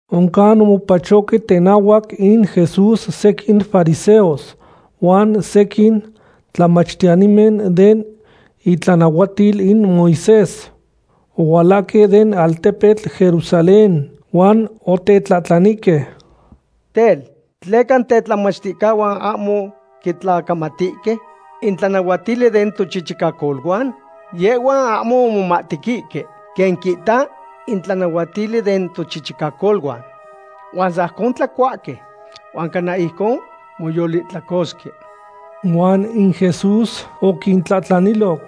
Oncan omopachohque tenahuac in Jesús sequin fariseos huan sequin tlamachtiyanimen den itlanahuatil in Moisés. Ohualahque den altepetl Jerusalén huan otetlahtlanihque: ―Tel, ¿tleca in tetlamachticahuan ahmo quitlacamatihque in tlanahuatili den tochichicacoluan? Yehhuan ahmo omomahtequihque quen quihta in tlanahuatili den tochichicacoluan huan sajcon tlacuahque huan cana ijcon moyolihtlacosque. Huan in Jesús oquintlahtlaniloc: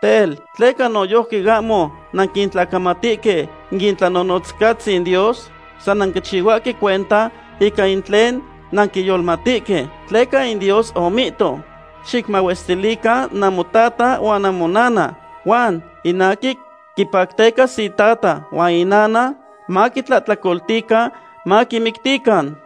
―Tel, ¿tleca noyojqui ahmo nanquitlacamatihque in itlanahuatiltzin Dios? San nanquichihuahque cuenta ica in tlen nanquiyolmatque. Tleca in Dios omihto: “Xicmahuestilican namotata huan namonana”, huan “In aquin quipactecas itata huan inana maquitlahtlacoltican maquimictican.”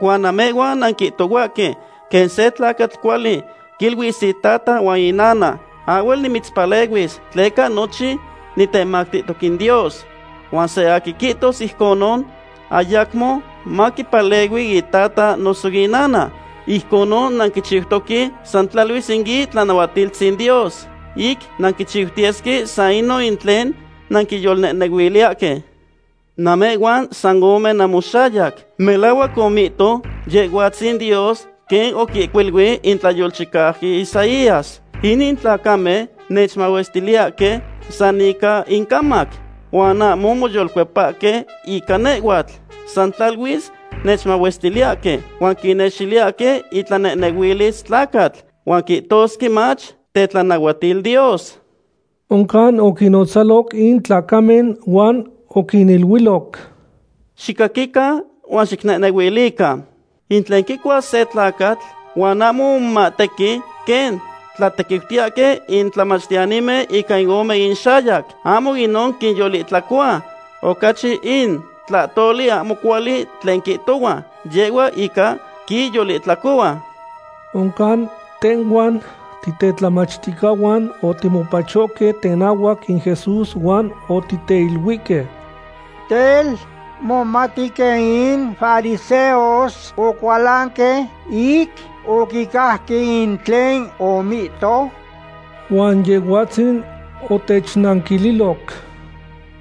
Huan namehhuan nanquihtohuahque quen se tlacatl cuali quiluis itata huan inana: “Ahhuel nimitzpaleluis tleca nochin nitemactihtoc in Dios.” Huan san aquin quihtos ijcon, ayacmo maquipalehui itata noso inana. Ijconon nanquichiutoque san tlaluis in itlanahuatiltzin Dios ic nanquichiutiyesque san inon tlen nanquiyolnehnehuiliyahque. Namehhuan san ome namoxayac. Melahuac omihto Yehhuatzin Dios quen oquihcuilui in tlayolchicauqui Isaías: Inin tlacamen nechmahuestiliyahque san ica incamac, huan ahmo moyolcuepasque ica nehhuatl. San tlaluis nechmahuestiliyahque. Huan quinextiliyahque itlanehnehuilis tlacatl, huan quihtosque mach tetlanahuatil Dios. Oncan oquinnotzaloc in tlacamen huan oquiniluiloc: ―Xicaquican huan xicnehnehuilican. In tlen quicuas se tlacatl, huan ahmo omomahtequi quen tlatequiutiyahque in tlamachtiyanimen ica in ome inxayac, ahmo inon quiyolihtlacohua. Ocachi in tlahtoli ahmo cuali tlen quihtohua, yeh in ica quiyolihtlacohua. Oncan tehhuan titetlamachticahuan otimopachohque tenahuac in Jesús huan otiteiluihque: ―Tel, ¿momati quen in fariseos ocualanque ic oquicajque in tlen omihto? Huan Yehhuatzin otechnanquililoc: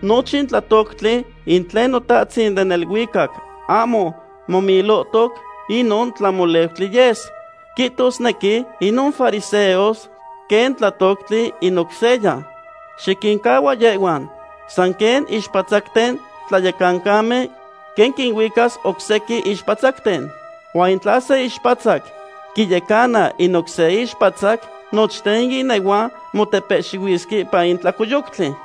―Nochin tlatoctli in tlen Notahtzin den neluicac ahmo momilohtoc, inon tlamoleutli yes, quihtosnequi inon fariseos quen tlatoctli in oc seya. Xiquincahua yehhuan. San quen ixpatzacten tlayecancamen quen quinuicas oc sequin ixpatzacten. Huan in tla se ixpatzac quiyecana in oc se ixpatzac, nochten in inehuan motepehxihuisque ipan in tlacoyoctli.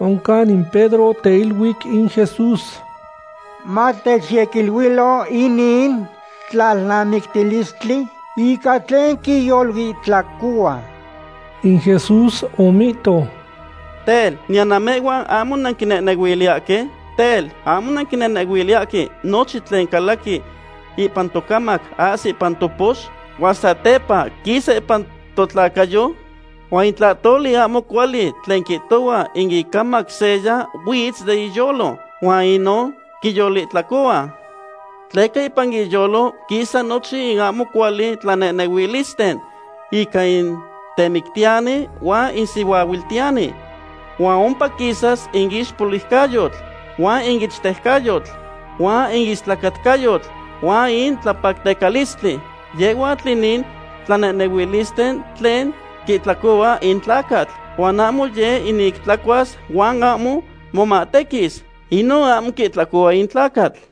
Oncan in Pedro oteiluic in Jesús: ―Matechyequiluilo inin tlalnamictilistli, ica tlen quiyolihtlacohua. In Jesús omihto: ―Tel, ¿niyan namehhuan ahmo nanquinehnehuiliyahque? Tel, ¿ahmo nanquinehnehuiliyahque nochin tlen calaqui ipan tocamac ahsi ipan topox, huan satepa quisa ipan totlacayo? Huan in tlahtoli ahmo cuali tlen quihtohua in icamac seya huitz den iyolo, huan inon quiyolihtlacohua. Tleca ipan iyolo quisa nochin in ahmo cuali tlanehnehuilisten ica in temictiyani huan in sihuaahuiltiyani. Huan ompa quisas in ixpoliucayotl huan in ichtejcayotl, huan in istlacatcayotl huan in tlapactecalistli. Yehhuatl inin tlanehnehuilisten tlen quihtlacohua in tlacatl. Huan ahmo yeh in ic tlacuas huan ahmo momahtequis. Inon ahmo quihtlacohua in tlacatl.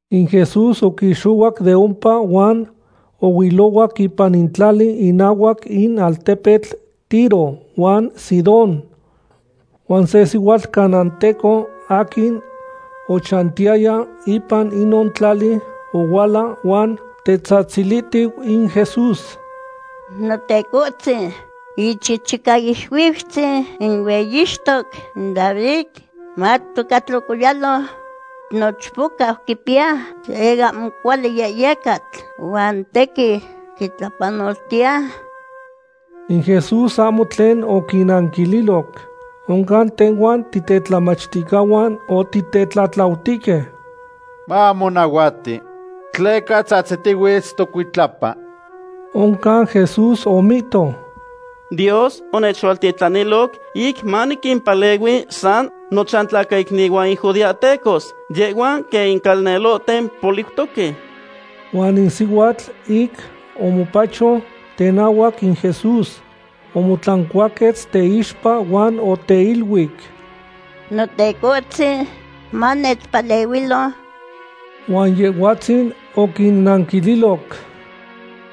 In Jesús oquixohuac de ompa huan ohuilohuac ipan in tlali inahuac in altepemen Tiro huan Sidón. Huan se sihuatl canaanteco aquin ochantiyaya ipan inon tlali ohuala huan tetzahtzilihtiu in Jesús: ―¡Notecohtzin, Ichichicaixuiutzin in hueyixtoc David, matoca tlocoyalo! Nochpocau quipiya se ahmo cuali yehyecatl huan tequin quitlapanoltiya. In Jesús ahmo tlen oquinanquililoc. Oncan tehhuan titetlamachticahuan otitetlatlautihque: ―Mamonahuati, tleca tzahtzitihuitz tocuitlapa. Oncan Jesús omihto: ―Dios onechualtitlanilo ic maniquimpalehui san nochantlacaicnihuan in judeahtecos. Yehhuan quen in calnelohten poliutoque. Huan in sihuatl ic omopacho tenahuac in Jesús, omotlancuaquetz teixpa huan oteiluic: ―¡Notecohtzin, manechpalehuilo! Huan Yehhuatzin oquinanquililoc: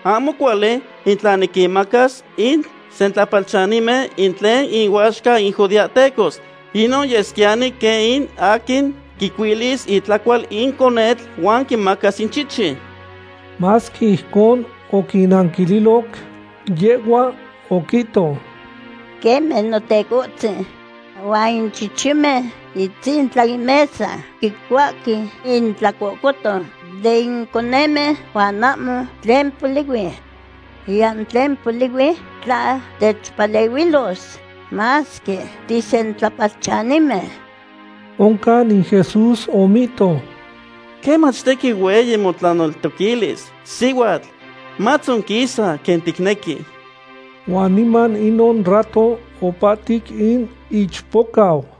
―Ahmo cuali in tla niquinmacas in sentlapalchanimen in tlen inuaxca in judeahtecos. Inon yesquiyani quen in aquin quicuilis itlacual in conetl huan quimacas in chichi. Masque ijcon oquinanquililoc, yehhua oquihto: ―Queme Notecohtzin; huan in chichimen itzintla in mesa quicuahque in tlahtlacoton den conemen huan ahmo tlen polihui. Niyan tlen polihui tla techpalehuilos, masque tisentlapalchanimen. Oncan in Jesús omihto: ―¡Quemach, tequin hueyi motlaneltoquilis, sihuatl! Matzonquisa quen ticnequi. Huan niman inon rato opahtic in ichpocau.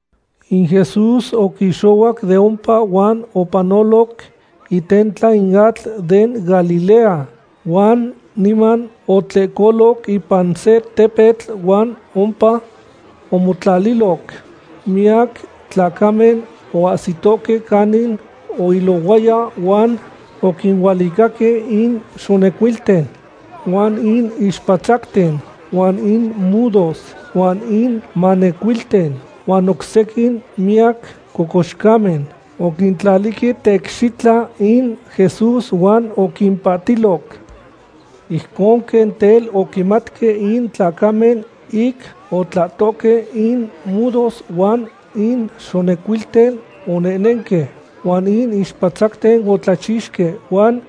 In Jesús oquixohuac de ompa huan opanoloc itentla in atl den Galilea. Huan niman otlehcoloc ipan se tepetl huan ompa omotlaliloc. Miyac tlacamen oahsitohque canin oilohuaya huan oquinualicaque in xonecuilten, huan in ixpatzacten, huan in mudos, huan in manecuilten, huan oc sequin miyac cocoxcamen. Oquintlalihque teicxitla in Jesús huan oquimpahtiloc. Ijcon quen tel oquimatque in tlacamen ic otlahtohque in mudos huan in xonecuilten onehnenque, huan in ixpatzacten otlachixque. Huan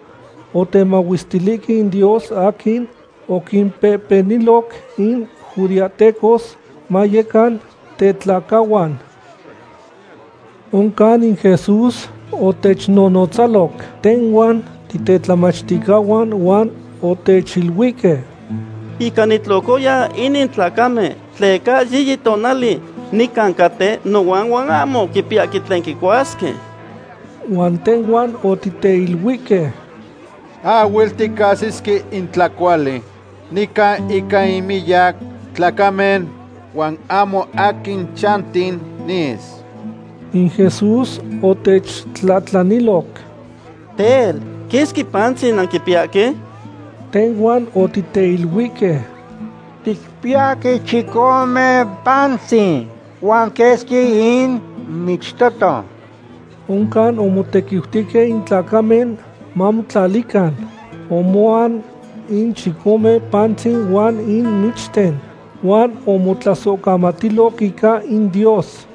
otemahuestilihque in Dios aquin oquimpehpeniloc in judeahtecos mayecan tetlacahuan. Oncan in Jesús otechnonotzaloc tehhuan titetlamachticahuan huan otechiluihque: ―Inca nitlocoya inin tlacamen tleca yiyi tonali nican caten nohuan huan ahmo quipiyahque tlen quicuasque. Huan tehhuan otiteiluihque: ―Ahhuel ticahsisque in tlacuali nican ica in miyac tlacamen huan ahmo aquin chanti nis. In Jesús otechtlahtlaniloc: ―Tel, ¿quesqui pantzin nanquipiyahque? Tehhuan otiteiluihque: ―Ticpiyahque chicome pantzin, huan quesqui in michtoton. Oncan omotequiutihque in tlacamen mamotlalican. Omoan in chicome pantzin huan in michten, huan omotlasohcamatiloc ica in Dios.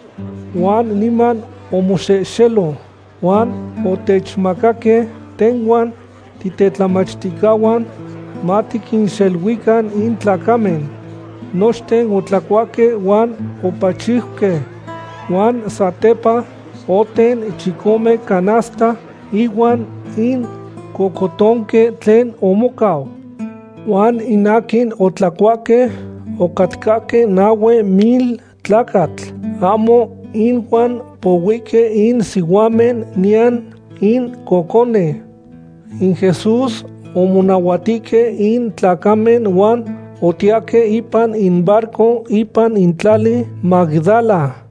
Huan niman omoxehxelo huan otechmacaque tehhuan titetlamachticahuan matiquinxeluican in tlacamen. Nochten otlacuahque huan opachiuque. Huan satepa, oten chicome canasta ihuan in cohcotonque tlen omocau. Huan in aquin otlacuahque ocatcahque nahue mil tlacatl, ahmo inuan pohuihque in sihuamen niyan in cocone. In Jesús omonahuatihque in tlacamen huan otiyahque ipan in barco ipan in tlali Magdala.